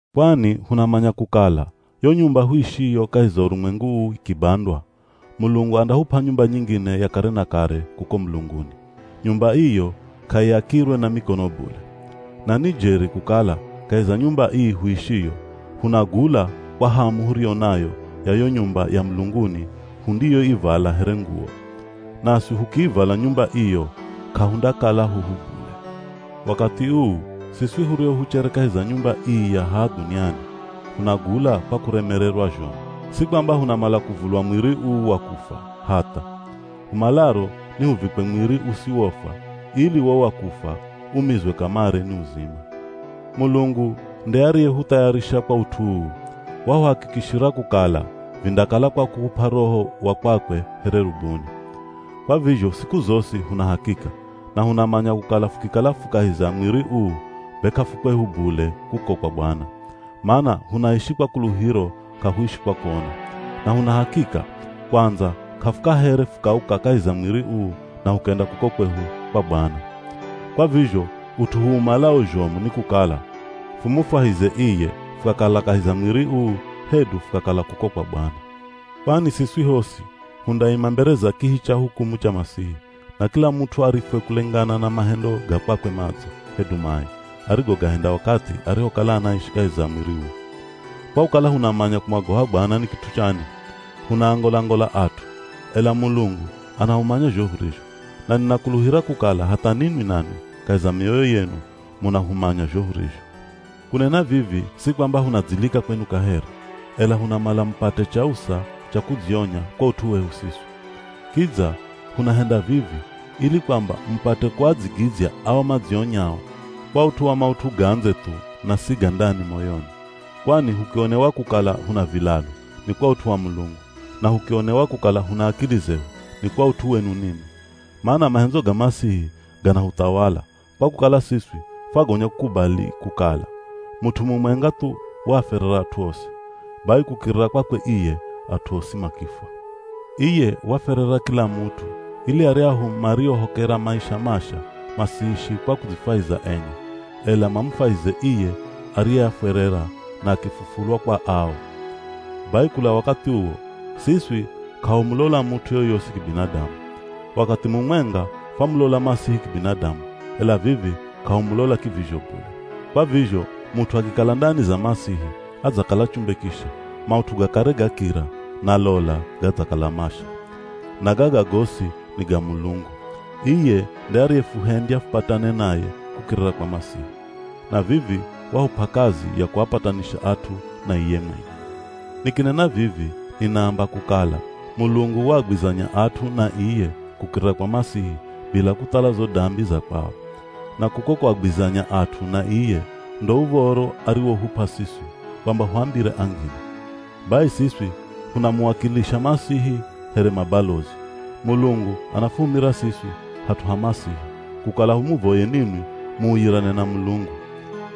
Kwani hunamanya kukala yo nyumba huishiyo kahi za urumwengu uu ikibandwa, Mulungu andahup'a nyumba nyingine ya kare na kare kuko mulunguni. Nyumba iyo k'aiakirwe na mikono bule. Na ni jeri kukala kahi za nyumba ii huishiyo, hunagula kwa hamu huriyo nayo ya yo nyumba ya mulunguni hundiyoivala here nguwo. Naswi hukiivala nyumba iyo k'ahundakala huhu bule. Wakathi uu, siswi hurio huchere kahi za nyumba ii ya haha dhuniani, hunagula kwa kuremererwa zhomu. Si kwamba hunamala kuvulwa mwiri uu wa kufwa, hatha. Humalaro ni huvikwe mwiri usiwofwa ili wo wa kufwa umizwe kamare ni uzima. Mulungu nde ariyehuthayarisha kwa ut'u uu, wahuhakikishira kukala vindakala kwa kuhup'a Roho wa kwakwe here rubuni. Kwa vizho siku zosi huna hakika, na hunamanya kukala fukikala fu kahi za mwiri uu be k'afukwehu bule kuko kwa Bwana. Mana hunaishi kwa kuluhiro k'ahuishi kwa kuona. Na huna hakika, kwandza k'afukahere fukauka kahi za mwiri uu na hukenda kuko kwehu, kwa Bwana. Kwa vizho ut'u huumalao zhomu ni kukala, fumufwahize iye fukakala kahi za mwiri uu hedu fukakala kuko kwa Bwana. Kwani siswi hosi hundaima mbere za kihi cha hukumu cha Masihi, na kila mut'u arifwe kulengana na mahendo ga kwakwe madzo, hedu mai, arigogahenda wakathi arihokala anaishi kahi za mwiri uu. Kwa kukala hunamanya kumwagoha Bwana ni kit'u chani, hunaangola-ngola at'u. Ela Mulungu anahumanya zho hurizho, na ninakuluhira kukala hatha ninwi nanwi kahi za mioyo yenu munahumanya zho hurizho. Kunena vivi si kwamba hunadzilika kwenu kaheri, ela hunamala mupate chausa cha kudzionya kwa ut'u wehu siswi. Kidza hunahenda vivi ili kwamba mupate kuadzigidzya ao madzionyao kwa ut'u wa maut'u ga ndze thu na si ga ndani moyoni. Kwani hukionewa kukala huna vilalu, ni kwa ut'u wa Mulungu. Na hukionewa kukala huna akili zehu, ni kwa ut'u wenu ninwi. Mana mahendzo ga Masihi ganahuthawala, kwa kukala siswi fwagonya kukubali kukala, mut'u mumwenga thu waafwerera at'u osi. Bai kukirira kwakwe iye at'u osi makifwa. Iye wafwerera kila mut'u ili aryahu mariohokera maisha masha masiishi kwa kudzifwahiza enye, ela mamufwahize iye ariyeafwerera na akifufulwa kwa ao. Bai kula wakathi uwo, siswi k'ahumulola mut'u yoyosi kibinadamu. Wakathi mumwenga fwamulola Masihi kibinadamu ela vivi k'ahumulola kivizho bule. Kwa vizho mut'u akikala ndani za Masihi adzakala chumbe kisha, maut'u ga kare gakira, na lola, gadzakala masha. Na gaga gosi ni ga Mulungu. Iye nde ariyefuhendya fupatane naye kukirira kwa Masihi. Na vivi wahup'a kazi ya kuapatanisha at'u na iye mwenye. Nikinena vivi ninaamba kukala Mulungu waagwizanya at'u na iye kukirira kwa Masihi bila kuthala zo dambi za kwao. Na kuko kuagwizanya at'u na iye ndo uv̱oro ariwohup'a siswi kwamba huambire angine. Bai, siswi hunamuwakilisha Masihi here mabalozi. Mulungu anafuhumira siswi hat'u ha Masihi kukala humuvoye ninwi muuyirane na Mulungu.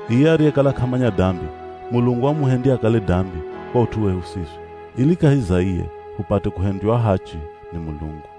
Iye ariyekala k'amanya dambi, Mulungu wamuhendya akale dambi kwa ut'u wehu siswi, ili kahi za iye hupate kuhendywa ahachi ni Mulungu.